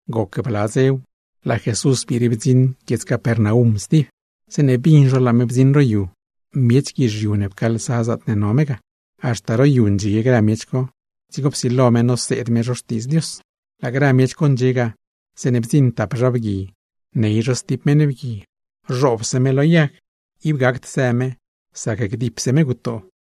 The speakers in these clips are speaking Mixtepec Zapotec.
Goc bla dzew, laa Jesús biire bdziṉ lad guiedz Capernaum stib. Zeeṉe bin zho laa me bdziṉ ro yu, miech guizhiu ne pcaalsa zaatne no me ga, haxta ro yu ndxie grë miech co; dzigo psilo me noseed me zho Xtiidz Dios. Laa grë miech co ndxie ga, zeeṉe bdziṉ tap zha bgui ney zho stib meṉ bgui, zhoobse me lo yag, ib gacd së me sac dipse me gutoo.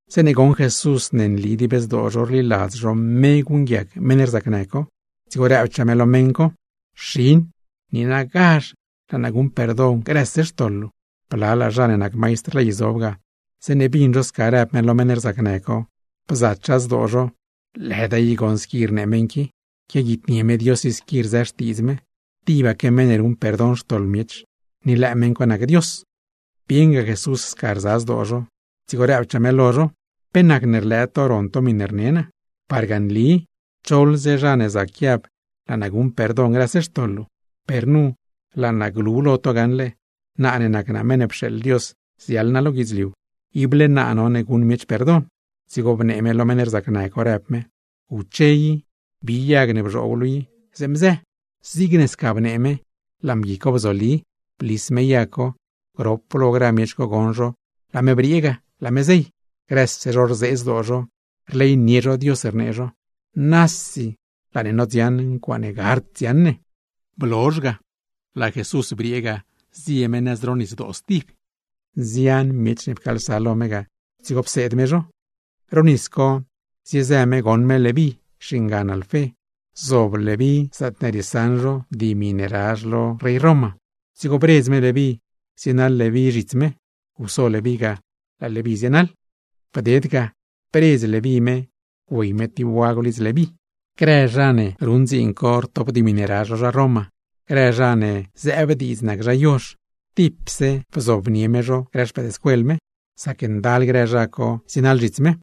Zeeṉe goṉ Jesús ne nli dib zdoo zho rliladz zho me guṉguiac meṉ rzacnë co, dzigo rëbchaa me lo meṉ co: ―Xin, niinagazh laa naa guṉ perdon grëse xtoḻ luu. Blalaa zha ne nac maistr ley zob ga, zeeṉe bin zho sca rëb me lo meṉ rzacnë co, bzachaa zdoo zho: “¡Lëda i goṉ squi rnee meṉ qui! Quiaguitnie me Dios i squi rzë xtiidz me. ¡Tibaque meṉ ne ruṉ perdon xtoḻ miech, ni lëë meṉ co nac Dios!” Bieṉga Jesús sca rza zdoo zho, dzigo rëbchaa me: ―¿Pe nacne rlëë to ron to miṉe rne naa? Parga nli, choḻze zha ne zac guiab: “Laa naa guṉ perdon grëse xtoḻ luu.” Per laa naa glu lo to gaṉle, naa ne nac naa Meṉ ne pxeeḻ Dios ziaḻ naa lo guidzliu, ible naa no guṉ miech perdon. Dzigo bnee me lo meṉ rzacnë co, rëb me: ―¡Guche i, bi yag ne bzhoob luu i, zeeṉ bzë! Zigne sca bnee me laa mgui co bzoli, blis me yag co, grop lo grë miech co goṉ zho laa me briee ga, laa me zey. Grëse zho rzee zdoo zho, rleynie zho Dios rnee zho: ―¡Nasi laa ne nodziaṉ ncuaaṉe gard dziaṉ ne! Blozh ga, laa Jesús briee ga laa me zie nëz ro nisdoo stib; nzian miech ne pcaalsa lo me ga, dzigo pseed me zho. Ro nis co ziezë me goṉ me Leví, xingan Alfé, zob Leví zaatne rietizh zho contribucion, dzigo bredz me Leví tsienaḻ Leví zhits me. Guso Leví ga, laa Leví zienaḻ. Bded ga, bredz Leví me güey me tib wagw lidz Leví. Grë zha ne nac recaudador, grë zha ne zëëb diidz nac zha yozh, tipse lo mezh bzobnie me zho grë xpëëdscuel me; sac ndal grë zha co zienaḻ zhits me.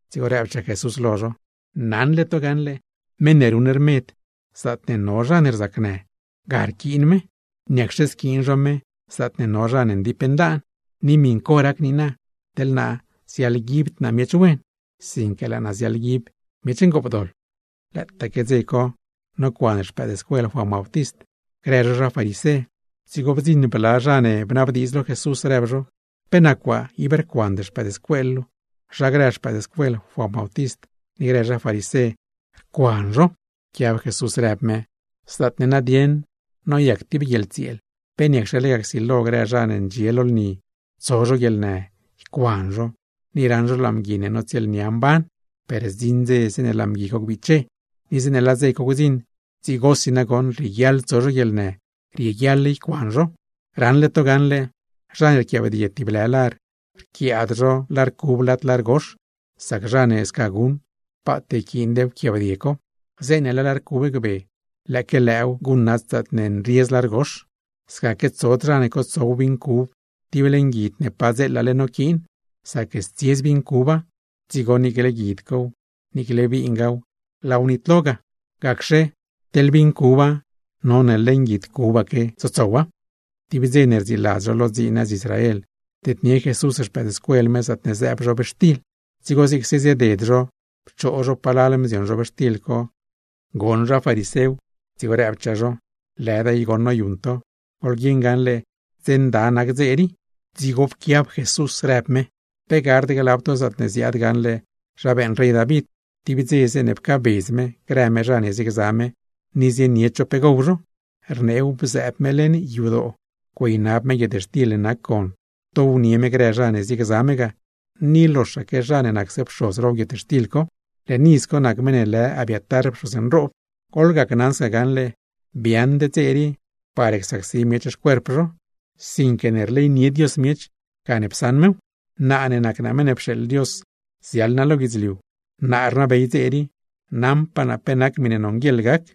Dzigo rëbchaa Jesús lo zho: ―Naṉle to gaṉle, meṉ ne ruṉ rmed, zaatne no zha ne rzacnë, ga rquiin zho, ¿niacxe squiin zho zaatne no zha ne ndip ndaan? Ni miṉ co rac niina, teḻ naa ziaḻguibd naa miech wen, sinque laa naa ziaḻguib miech ngoopdoḻ. Lëëtaaque dze co nocuan xpëëdscuel Juan Bautist, grë zho zha farisé. Dzigo bdziṉ bla zha ne bnabdiidz lo Jesús, rëb zho: ―¿Pe nac waa ib rcuand xpëëdscuel luu? Zha grë xpëëdscuel Juan Bautist ni grë zha farisé, rcuan zho. Pquiab Jesús, rëb me: ―Zaatne nadieṉ noyac tib guieḻtsieel, ¿pe niacxe lega csilo grë zha ne ndxie lo lni tso zho guieḻnë, ycuan zho ni raṉ zho laa mgui ne notsieelnia mban? Per zdziṉ dze zeeṉe laa mgui co gbiche; ni zeeṉe laa dze co gdziṉ, dzigosi nagoṉ rieguiaḻ tso zho guieḻnë, rieguiaḻ ycuan zho. ’Raṉle to gaṉle, zha ne rquiaabdie tib lë lar, rquiaad zho lar cub lad lar gox, sac zha ne sca guṉ paat yquiind wquiaabdie co. Zeeṉe laa lar cub gbe, lëëque lëëw guṉnat zaatne nriez lar gox. Scaque tsod zha ne cotsow vin cub tib leṉ guid ne padzeelale noquiin, sac stsiez vin cuba; dzigo niicle guid cow, niicle vingaaw laaw nitlo ga. Gacxe, teḻ vin cuba none leṉ guid cubaque tsotsowa. Tib dze ne rdziiladz zho lo dziin nëz Israel, bdednie Jesús xpëëdscuel me zaatne zëëb zhobxtil, dzigo zigse zieded zho pchoo zho palal mzion zhobxtil co. Goṉ zha farisew, dzigo rëbchaa zho: ―¡Lëda i goṉ noyuṉ to! ¡Goḻguieṉ gaṉle dze nda nac dze rii! Dzigo pquiab Jesús, rëb me: ―¿Pe gard glab to zaatne ziaad gaṉle zha beeṉ rey David tib dze zeeṉe pcaabedz me grë me zha ne ziegza me, ni zienied zho pe gow zho? Rneew, bzëëb me leṉ yadoo güeynab me guietxtil ne nac gon, downie me grë zha ne ziegza me ga, ni loxaque zha ne nacse pxoz row guietxtil co. Leṉ iz co nac meṉ ne lë Abiatar pxoz nroob. Goḻgacnaṉ sca gaṉle, biaaṉd dze rii par csacsi miech xcuerp zho, sinque ne rleynie Dios miech gane psaṉ mew. Naa ne nac naa Meṉ ne pxeeḻ Dios ziaḻ naa lo guidzliu, naa rnabey dze rii, naṉpaa naa pe nac miṉe nonguieḻ gac.